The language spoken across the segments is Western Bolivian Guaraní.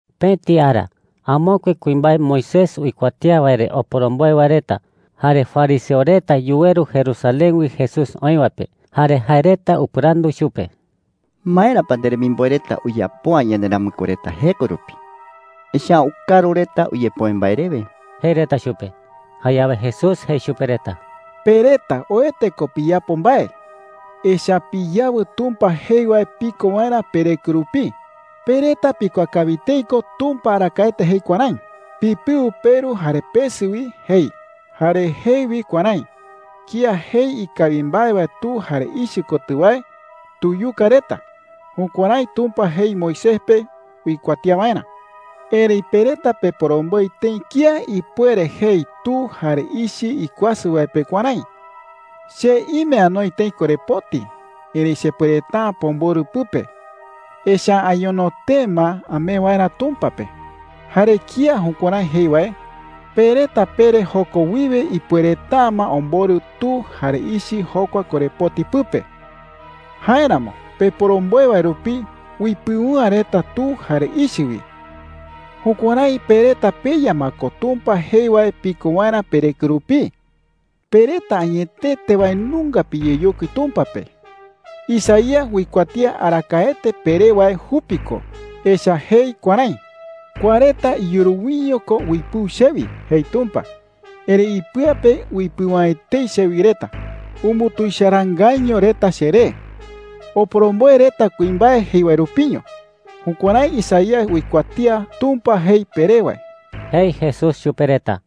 Pëti ara amokue kuimbae Moisés uikuatía wae re oporomboe wae reta jare fariseo reta yuweru Jerusalén wi Jesús oï wae pe. Jare jae reta upɨrandu chupe: “¿Maera pa nderemimboe reta uyapo’ä yanderamɨkue reta jeko rupi? Echa’ä ukaru reta uyepoe mbae rewe,” jei reta chupe. Jayawe Jesús jei chupe reta: “Pe reta oete ko piyapo mbae, echa’ä piyawɨ Tumpa jei wae piko waerä pereko rupii. Pe reta pikuaa kawi tëi ko Tumpa arakaete jei kuärái: ‘Pipɨu peru jare pesɨ wi,’ jei. Jare jei wi kuärái: ‘Kía jei ikawi mbae wae tu jare ichɨ kotɨ wae, tuyuka reta.’ Jukuärái Tumpa jei Moisés pe uikuatía waerä. Erëi pe reta peporomboe tëi kía ipuere jei tu jare ichɨ ikuasɨ wae pe kuärái: ‘Che ime anoi tëi korepoti, erëi chepuereta’ä pomborɨ pɨpe, echa’ä añono tee ma amee waerä Tumpa pe.’ Jare kía jukuärái jei wae, pe reta pere joko wiwe ipuereta’ä ma omborɨ tu jare ichɨ jokua korepoti pɨpe. Jáeramo peporomboe wae rupi uipɨu’ä reta tu jare ichɨ wi. Jukuärái pe reta peya ma ko Tumpa jei wae piko waerä pereko rupii,” jei chupe reta. “Pe reta añetete wae nunga piyeyokui Tumpa pe. Isaías uikuatía arakaete peré wae jupi ko. Echa’ä jei kuärái: ‘Kua reta iyuru wiño ko uipɨu chewi,’ jei Tumpa. ‘Erëi ipɨa pe uipɨu’ä etei chewi reta. Umbutuicharaangaiño reta cheree. Oporomboe reta kuimbae jei wae rupiño.’ Jukuärái Isaías uikuatía Tumpa jei peré wae,” jei Jesús chupe reta.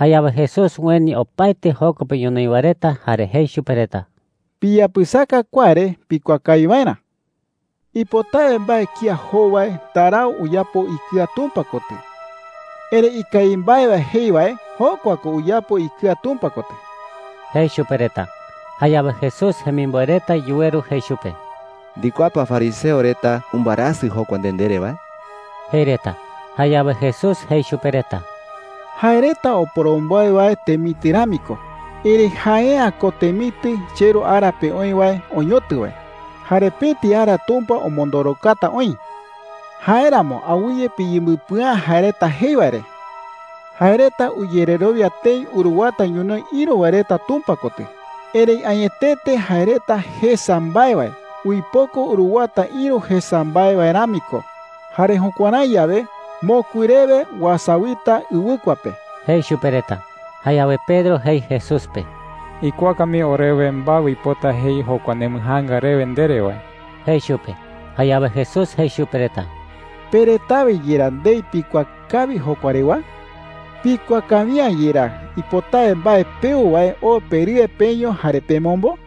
Jayawe Jesús ueni opaete joko pe ñonoï wae reta jare jei chupe reta: “Piyapɨsaka kua re pikuaa kawi waerä,” jei chupe reta. “Ipotawe mbae kía jou wae ndarau uyapo ikɨa Tumpa kotɨ. Erëi ikawi mbae wae jei wae, jokua ko uyapo ikɨa Tumpa kotɨ,” jei chupe reta. Jayawe Jesús jemimboe reta yuweru jei chupe: “¿Ndikuaa pa fariseo reta umbɨarasɨ jokua nde ndere wae?” jei reta. Jayawe Jesús jei chupe reta: “Jae reta oporomboe wae temitɨ rami ko. Erëi jae’ä ko temitɨ cheRu ara pe oï wae oñotɨ wae. Jare pëti ara Tumpa omondorokata oï,” jei. “Jáeramo awɨye piyembɨpɨa’ä jae reta jei wae re. Jae reta uyererowia tëi uruwata ñonoï ïru wae reta Tumpa kotɨ. Erëi añetete jae reta jesa mbae wae uipoko uruwata ïru jesa mbae wae rami ko. Jare jukuärái yawe, mokui rewe uasawita ɨwɨkua pe,” jei chupe reta. Jayawe Pedro jei Jesús pe: “Ikuaaka mii orewe mbae uipota jei jokua nembɨjaanga rewe ndere wae,” jei chupe. Jayawe Jesús jei chupe reta: “¿Pe retawe yerá ndei pikuaa kawi jokua rewa?” jei. “¿Pikuaa kawi’ä yerá ipotawe mbae peu wae oo perɨe peño jare pemombo?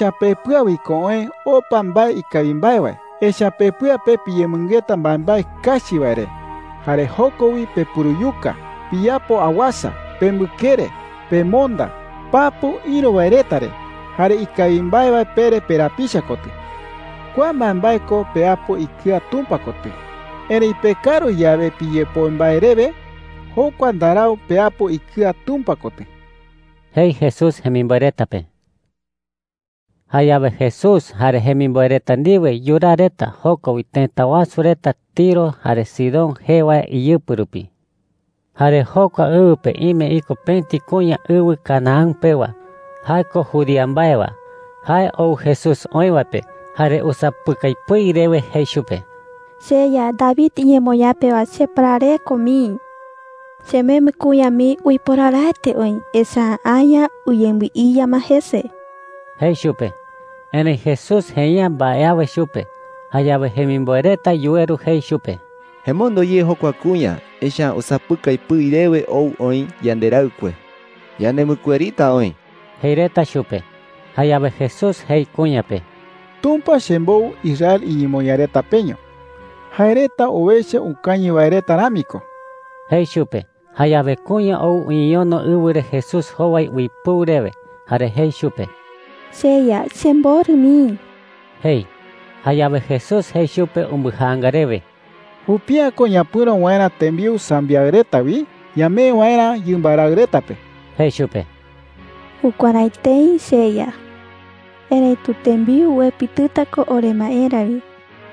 “Echa’ä pepɨa wi ko oë opa mbae ikawi mbae wae, echa’ä pepɨa pe piyemɨngeta mbaembae kachi wae re jare joko wi pepuruyuka, piyapo awasa, pembɨkere, pemonda, papu ïru wae reta re, jare ikawi mbae wae pere perapicha kotɨ,” jei. “Kua mbaembae ko peapo ikɨa Tumpa kotɨ. Erëi pekaru yawe piyepoe mbae rewe, jokua ndarau peapo ikɨa Tumpa kotɨ,” jei Jesús jemimboe reta pe. Jayawe Jesús jare jemimboe reta ndiwe yuraa reta joko wi tëta wasu reta Tiro jare Sidón jee wae iyɨpɨ rupi. Jare jokua ɨwɨ pe ime iko pëti kuña ɨwɨ Canaán pewa. Jae ko judía mbae wae. Jae ou Jesús oï wae pe, jare usapɨkai pɨi rewe jei chupe: “CheYa, David iñemoñaa pewa, cheparareko mii,” jei. “Chemembɨ kuña mii uiporaraete oï, echa’ä aña uyembɨiya ma jese,” jei chupe. Erëi Jesús jei’ä mbae awe chupe. Jayawe jemimboe reta yuweru jei chupe: “Emondo ye jokua kuña, echa’ä usapɨkai pɨi rewe ou oï yanderaɨkue. Yanembɨkuerita oï,” jei reta chupe. Jayawe Jesús jei kuña pe: “Tumpa chembou Israel iñemoñaa reta peño. Jae reta owecha ukañɨ wae reta rami ko,” jei chupe. Jayawe kuña ou uñeñono ɨwɨ re Jesús jowai uipɨu rewe, jare jei chupe: “CheYa, chemborɨ mii,” jei. Jayawe Jesús jei chupe umbɨjaanga rewe: “Jupi’ä ko ñapɨ̈ro waerä tembiu sambiaɨ reta wi ñamee waerä yɨmba raɨ reta pe,” jei chupe. “Jukuärái tëi, cheYa,” jei kuña. “Erëitu tembiu uepitɨta ko oremaerä wi,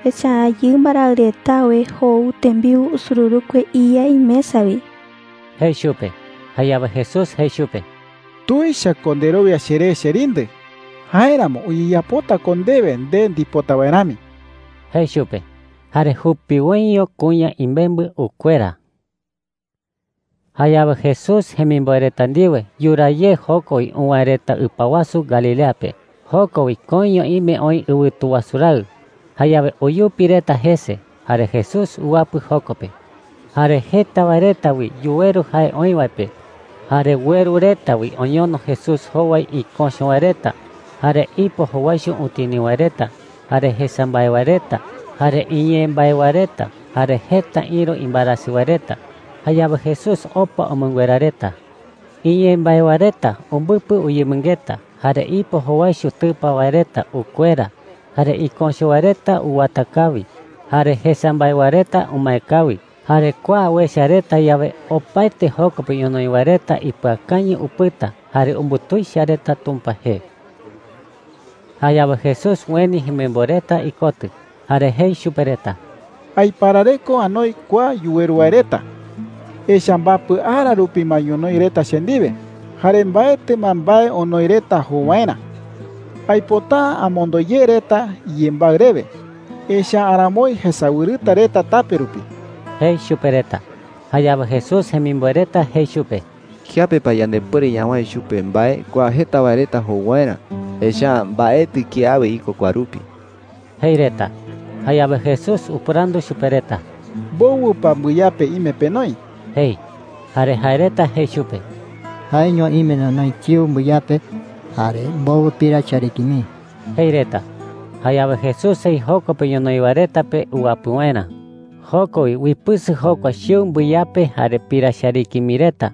echa’ä yɨmba raɨ retawe jou tembiu usururukue iya imesa wi,” jei chupe. Jayawe Jesús jei chupe: “¡Tuicha ko nderowia cheré, cherindɨ! Jáeramo uyeyapota ko ndewe nde ndipota wae rami,” jei chupe. Jare jupiwoiño kuña imembɨ ukuera. Jayawe Jesús jemimboe reta ndiwe yuraa ye joko wi uwäe reta ɨpa wasu Galilea pe. Joko wi koiño ime oï ɨwɨtu wasu raɨ. Jayawe uyupi reta jese, jare Jesús uwapɨ joko pe. Jare jeta wae reta wi yuweru jae oï wae pe. Jare ueru reta wi oñono Jesús jowai iköcho wae reta, jare ipo jowaicho utini wae reta, jare jesa mbae wae reta, jare iñee mbae wae reta, jare jeta ïru imbaerasɨ wae reta. Jayawe Jesús opa umɨnguera reta. Iñee mbae wae reta umbɨpɨ uyemɨngeta, jare ipo jowaicho tɨpa wae reta ukuera, jare iköcho wae reta uwata kawi, jare jesa mbae wae reta umae kawi. Jare kua uecha reta yawe, opaete joko pe ñonoï wae reta ipɨakañɨ upɨta jare umbutuicha reta Tumpa jee. Jayawe Jesús ueni jemimboe reta ikotɨ jare jei chupe reta: “Aiparareko anoi kua yuweru wae reta. Echa’ä mbapɨ ara rupi ma ñonoï reta che ndiwe, jare mbaetɨ ma mbae onoi reta jou waerä. Aipota’ä amondo ye reta iyembaɨ rewe, echa’ä aramoi jesawɨrɨta reta tape rupi,” jei chupe reta. Jayawe Jesús jemimboe reta jei chupe: “¿Kiape pa yandepuere ñawäe chupe mbae kua jeta wae reta jou waerä? Echa’ä mbaetɨ kiawe iko kua rupi,” jei reta. Jayawe Jesús upɨrandu chupe reta: “¿Mbowɨ pa mbɨyape ime penoi?” jei. Jare jae reta jei chupe: “Jaeño ime nonoi chiu mbɨyape, jare mbowɨ pira chariki mii,” jei reta. Jayawe Jesús jei joko pe ñonoï wae reta pe uwapɨ waerä. Joko wi uipɨsɨ jokua chiu mbɨyape jare pira chariki mii reta,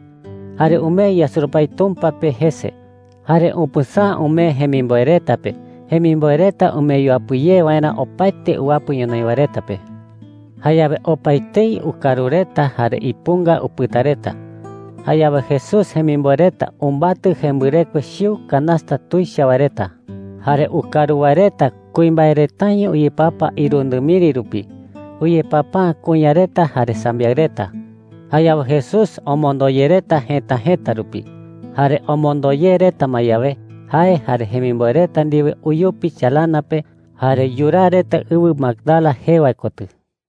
jare umee yasurupái Tumpa pe jese. Jare upɨsäa umee jemimboe reta pe, jemimboe reta umee yuapɨ ye waerä opaete uwapɨ ñonoï wae reta pe. Jayawe opaetei ukaru reta jare ipunga upɨta reta. Jayawe Jesús jemimboe reta umbatɨ jembɨrekue chiu canasta tuicha wae reta. Jare ukaru wae reta kuimbae retaño uyepapa irundɨ miri rupi. Uyepapa’ä kuña reta jare sambiaɨ reta. Jayawe Jesús omondo ye reta jëta jëta rupi. Jare omondo ye reta ma yawe, jae jare jemimboe reta ndiwe uyupi chalana pe, jare yuraa reta ɨwɨ Magdala jee wae kotɨ.